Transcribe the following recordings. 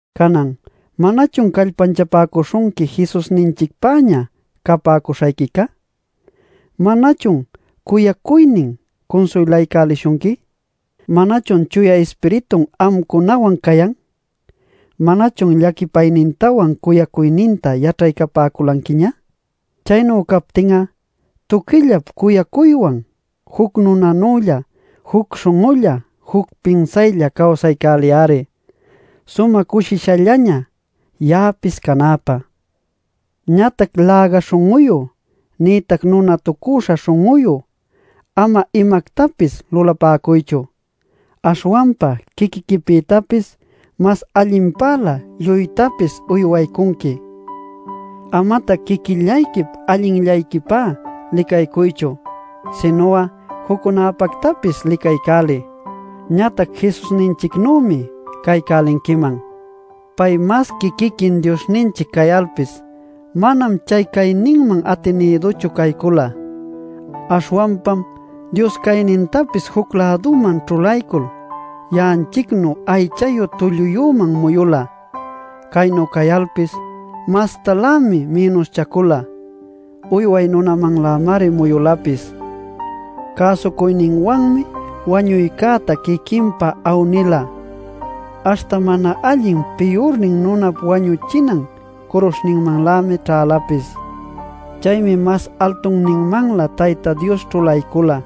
Canan ¿manachun callpanchapäcuśhunqui Jesusninchicpäña capäcuśhayquica? ¿Manachun cuyacuynin cunsuylaycälishunqui? ¿Manachun Chuya Ispiritun amcunawan cayan? ¿Manachun llaquipaynintawan cuyacuyninta yaćhaycapäculanquiña? Chaynu captin'a, tuquillap cuyacuywan juc nunanülla, juc śhun'ulla, juc pinsaylla cawsaycäliy-ari, sumä cushishallaña ya'apis canäpä. Ñatac läga śhun'uyu nïtac nunatucüśha śhun'uyu ama imactapis lulapäcuychu. Aśhwanpa quiquiquipïtapis mas allinpälä lluytapis uywaycunqui. Amatac quiquillayquip allinllayquipá licacuychu sinu'a juccunäpactapis licaycäliy. Ñatac Jesusninchicnümi caycälinquiman: Pay masqui quiquin Diosninchic cayalpis, manam chay cayninman atinïduchu caycula. Aśhwanpam Dios caynintapis juc-läduman ćhulaycul, ya'anchicnu aychayu tulluyüman muyula. Caynu cayalpis, mastalämi mïnuschacula; uyway nunamanlämari muyulapis. Cäsucuyninwanmi wañuycäta quiquinpa awnila; aśhta mana allin piyurnin nunap wañuchinan curuśhninmanlämi ćhälapis. Chaymi mas altunninmanlä Tayta Dios ćhulaycula;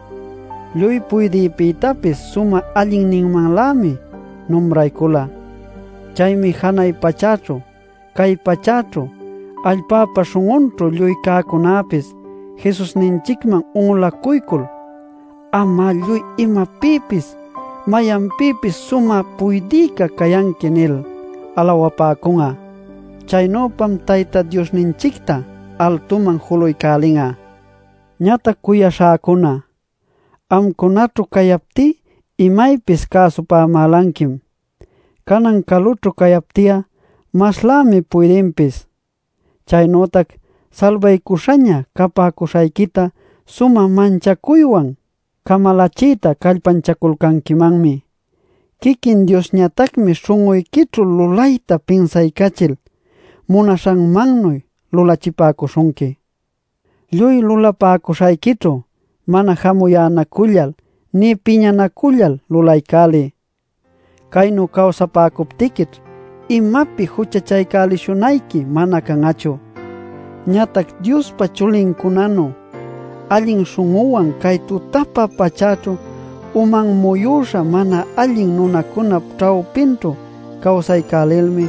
lluy puydïpïtapis sumä allinninmanlämi numraycula. Chaymi janay pachäćhu, cay pachäćhu, allpäpa śhun'unchu lluy cäcunäpis Jesusninchicman un'ulacuycul “Anmá lluy imapïpis mayanpïpis sumä puydïca cayanqui” nil alawapäcun'a. Chaynüpam Tayta Diosninchicta altuman julaycälin'a. Ñatac cuyaśhäcuna, amcunaćhu cayaptí imaypis cäsupämälanquim. Canan calućhu cayapti'a maslämi puydinpis. Chaynütac salbaycuśhaña capäcuśhayquita sumä manchacuywan camalachiyta callpanchaculcanquimanmi. Quiquin Diosñatacmi śhun'uyquićhu lulayta pinsaycachil munaśhanmannuy lulachipäcuśhunqui. Lluy lulapäcuśhayquićhu mana jamuyänacullal nï piñanacullal lulaycäliy. Chaynu cawsapäcuptiquićh imapi juchachaycälishunayqui mana can'achu. Ñatac Diospa chulincunanu allin śhun'uwan cay tutapä pachäćhu uman muyüśha mana allin nunacunap ćhawpinćhu cawsaycälilmi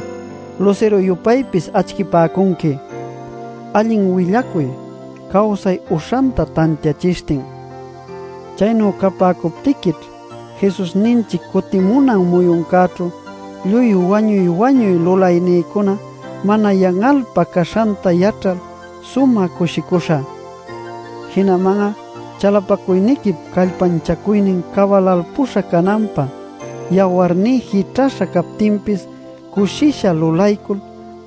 lusiru-yupaypis acchipäcunqui allin willacuy cawsay uśhanta tantiachishtin. Chaynu capäcuptiquićh Jesusninchic cutimunan muyuncäćhu lluy wañuy-wañuy lulaynïcuna mana yan'alpä caśhanta yaćhal sumä cushicuśhä. Jinaman'a chalapacuyniquip callpanchacuynin cabalalpuśha cananpä yawarní jićhäśha captinpis cushisha lulaycul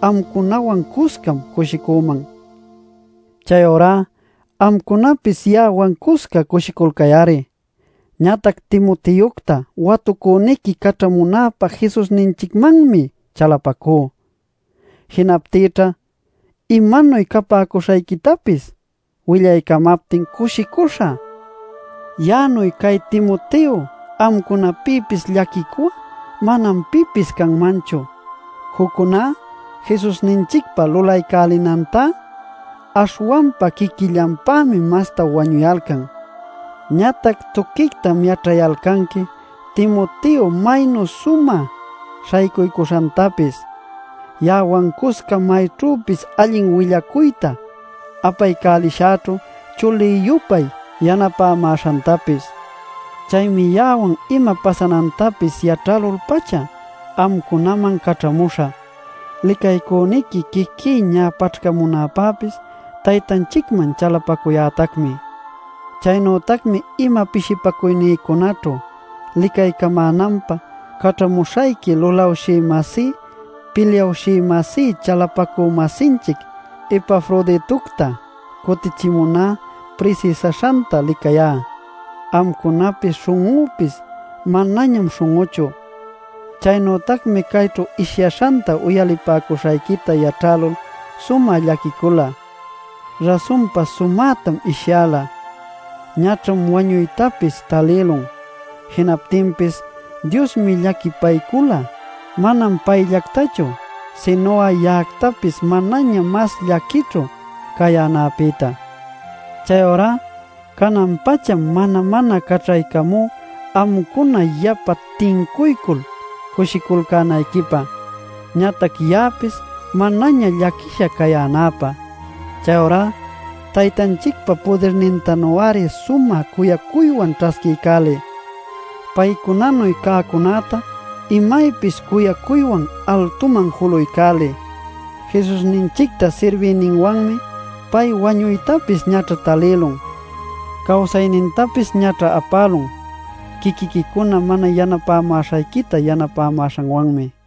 amcunawan cuscam cushicüman. Chayurá amcunapis ya'awan cusca cushiculcay-ari. Ñatac Timoteocta watucüniqui caćhamunäpä Jesusninchicmanmi chalapacú. Jinaptïćha imanuy capäcuśhayquitapis willaycamaptin cushicuśhä. Ya'anuy cay Timoteo amcunapïpis llaquicu'a manam pipis canmanchu. Juccuná Jesusninchicpa lulaycälinantá, aśhwanpa quiquillanpämi masta wañuyalcan. Ñatac tuquictam yaćhayalcanqui Timoteo maynu sumä śhaycuycuśhantapis, ya'awan cusca mayćhüpis allin willacuyta apaycälishäćhu chulï-yupay yanapämäśhantapis. Chaymi ya'awan ima pasanantapis yaćhälul-pacha amcunaman caćhamuśhä. Licaycüniqui quiquí ñä paćhcamunäpäpis Taytanchicman chalapacuyätacmi. Chaynütacmi ima pishipacuynïcunaćhu licaycamänanpä caćhamuśhayqui lulawshï-masí pilyawshï-masí chalapacü-masinchic Epafroditocta cutichimuná prisïsäśhanta licayá. Amcunapi śhun'unpis manañam śhun'uchu. Chaynütacmi cayćhu ishyaśhanta uyalipäcuśhayquita yaćhälul sumä llaquicula. Rasunpa sumätam ishyäla; ñaćham wañuytapis talïlun. Jinaptinpis Diosmi llaquipaycula, manam payllactachu sinu'a ya'actapis manaña mas llaquićhu cayänäpïta. Chayurá canan-pacham mana-mana caćhaycamú amcuna yapa tincuycul cushiculcänayquipä ñatac ya'apis manaña llaquisha cayänäpä. Chayurá Taytanchicpa pudirnintanu-ari sumä cuyacuywan ćhasquiycäliy. Paycunanu cäcunäta imaypis cuyacuywan altuman julaycäliy. Jesusninchicta sirbiyninwanmi pay wañuytapis ñaćha talïlun. Cawsaynintapis ñaćha apälun quiquiquicuna mana yanapämäśhayquita yanapämäśhanwanmi.